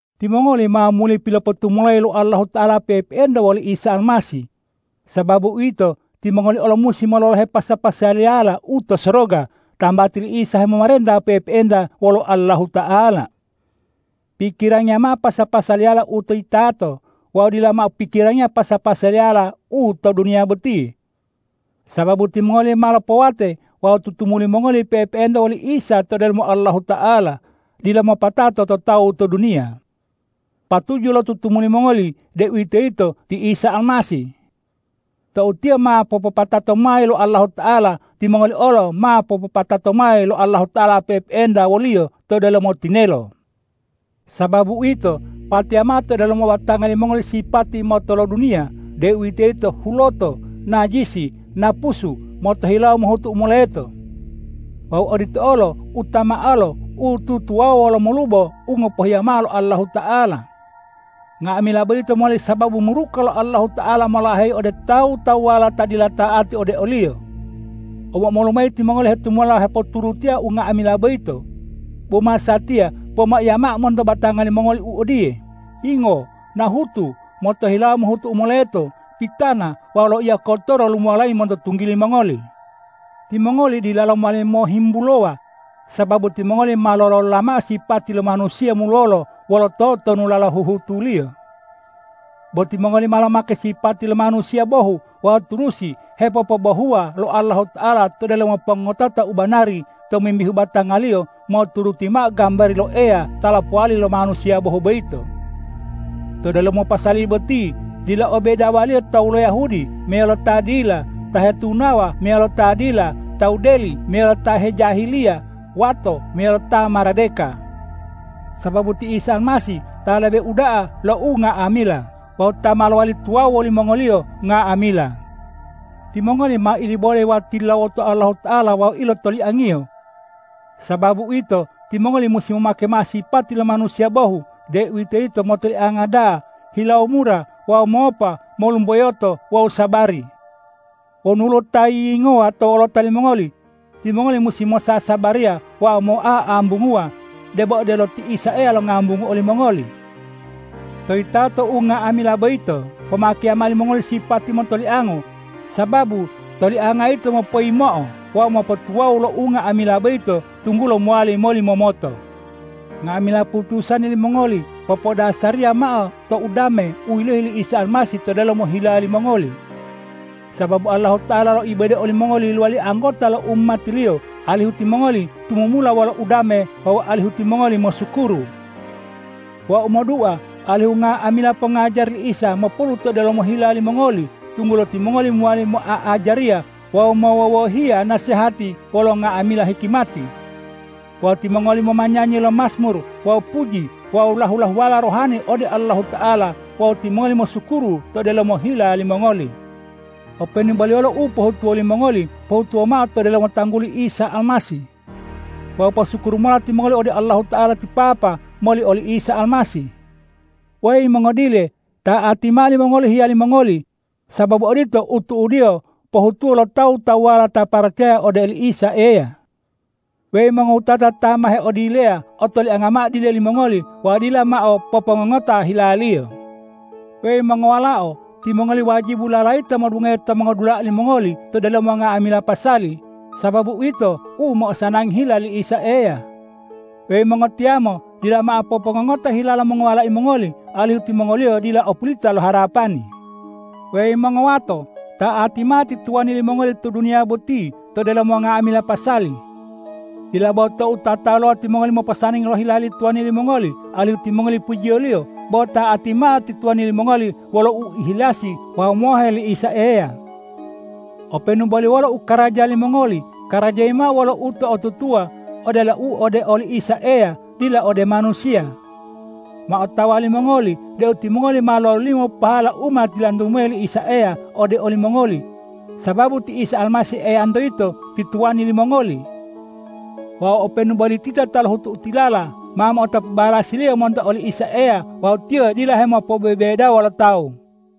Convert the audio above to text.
Timongoli ma muli pilopotumulayi lo Allahuta'ala pe'epe'enta woli Isa Almasih. Sababu uwito, timongoli olo musi mololohe pasa-pasaliyala u to soroga, tambati li Isa hemomarenta pe'epe'enta wolo Allahuta'ala. Pikirangiya mao pasa-pasaliyala u to yitato wawu dila mao pikirangiya pasa-pasaliyala u to duniya boti. Sababu timongoli ma lopowate wawu tutumuli mongoli pe'epe'enta woli Isa to delomo Allahuta'ala, dila mopatato to tawu to duniya. Patuju lo tutumuli mongoli, deuwitoyito ti Isa Almasih. Tou Tiyo ma popopatato mayi lo Allahuta'ala, timongoli olo ma popopatato mayi lo Allahuta'ala pe'epe'enta wo-Liyo to delomo tinelo. Sababu uwito, pateya mao to delomo batanga limongoli sipati motoloduniya, deuwitoyito huloto, najisi, napusu, motohilawo mohutu u moleto. Wawu odito olo utamaolo u tutuwawuwa wolo umolubo u ngopohiya mao lo Allahuta'ala. Nga'amila boyito mowali sababu muruka lo Allahuta'ala molaheyi ode tawu-tawuwala ta dila ta'ati ode o-Liyo. Omo-omolu mayi timongoli hetumula hepoturutiya unga'amila boyito. Bo masatiya pomaiya mao monto batanga limongoli u odiye: Yingo, nahutu, motohilawo mohutu u moleto, pitana wawu loiya kotoro lumuwalayi monto tunggili mongoli. Timongoli dilalo mowali mohihimbulowa, sababu timongoli ma lolola mao sipati lo manusiya mulolo wolo totonulala huhutuliyo. Bo timongoli ma lomake sipati lo manusiya bohu wawu turusi hepopobohuwa lo Allahuta'ala to delomo pongotota u banari tomimbihu batanga-Liyo moturuti mao gambari lo Eya ta lopowali lo manusiya bohu boyito. To delomo pasali boti dila o bedawaliyo tawu lo Yahudi meyalo ta dila, ta hetunawa meyalo ta dila, tawu deli meyalo ta hejahiliya, wato meyalo ta maradeka. Sababu ti Isa Almasih ta lebe uda'a lo unga'amila wawu ta ma lowali tuwawu wolimongoliyo nga'amila. Timongoli ma ilibode wawu tilulawoto Allahuta'ala wawu ilotoliang-Iyo. Sababu uwito, timongoli musi momake mao sipati lo manusiya bohu, deuwitoyito motolianga da'a, hilawo mura wawu mopa, molumboyoto wawu sabari. Wonu woluwo ta yiyingowa to wolota limongoli, timongoli musi mosasabariya wawu moa'ambunguwa, debo odelo ti Isa Eya longambungu olimongoli. To yitato unga'amila boyito, pomakeya mao limongoli sipati motoliango, sababu tolianga yito mopoyimo'o wawu mopotuwawu lo unga'amila boyito, tunggulo mowali molimomoto. Nga'amila putusani limongoli popodasariya mao to udame u yilohi li Isa Almasih to delomo hila limongoli. Sababu Allahuta'ala loibode olimongoli lowali anggota lo umati-Liyo, alihu timongoli tumumula wolo udame wawu alihu timongoli mosukuru. Wau modua alihu nga'amila pongajari li Isa mopolu to delomo hila limongoli, tunggulo timongoli mowali moa'ajariya wawu mowowohiya nasehati wolo nga'amila hikimati. Wawu timongoli momanyanyi lo majmur wawu puji wawu lahu-lahuwala rohani ode Allahuta'ala wawu timongoli mosukuru to delomo hila limongoli. Openu boli wolo u pohutuwo limongoli, pohutuwa mao to delomo tangguli Isa Almasih. Wawu posukuru mola timongoli ode Allahuta'ala ti Papa moli oli Isa Almasih. Weyi mongodile, ta'ati mao limongoli hiyali mongoli, sababu odito u tu'udiyo pohutuwo lo tawu-tawuwala ta paracaya ode oli Isa Eya. Weyi mongowutata ta ma heodileya, otolianga mao dile limongoli wawu dila mao popongongota hilaliyo. Weyi mongowalao, timongoli wajibu lalayita modungohe to mongodula'a limongoli to delomo nga'amila pasali, sababu uwito u mo'osanangi hila li Isa Eya. Weyi mongotiyamo, dila mao popongongota hila lo mongowalai mongoli, alihu timongoliyo dila opulita lo harapani. Weyi mongowato, ta'ati mao ti tuwani limongoli to duniya boti to delomo nga'amila pasali. Dila bo tou tataluwa timongoli moposanangi lo hila li tuwani limongoli alihu timongoli pujiyoliyo, bo ta'ati mao ti tuwani limongoli wolo uihilasi wawu mohe li Isa Eya. Openu boli wolo u karaja limongoli, karajayi mao wolo uto'otutuwa odelo u ode oli Isa Eya dila ode manusiya. Ma otawa limongoli deu timongoli ma mololimo pahala u ma tilantu mayi li Isa Eya ode olimongoli, sababu ti Isa Almasih Eyanto yito ti tuwani limongoli. Wawu openu boli tita ta lohutu u tilala, ma mo'otapu balasiliyo monto oli Isa Eya wawu Tiyo dila hemopobebedawo lo tawu.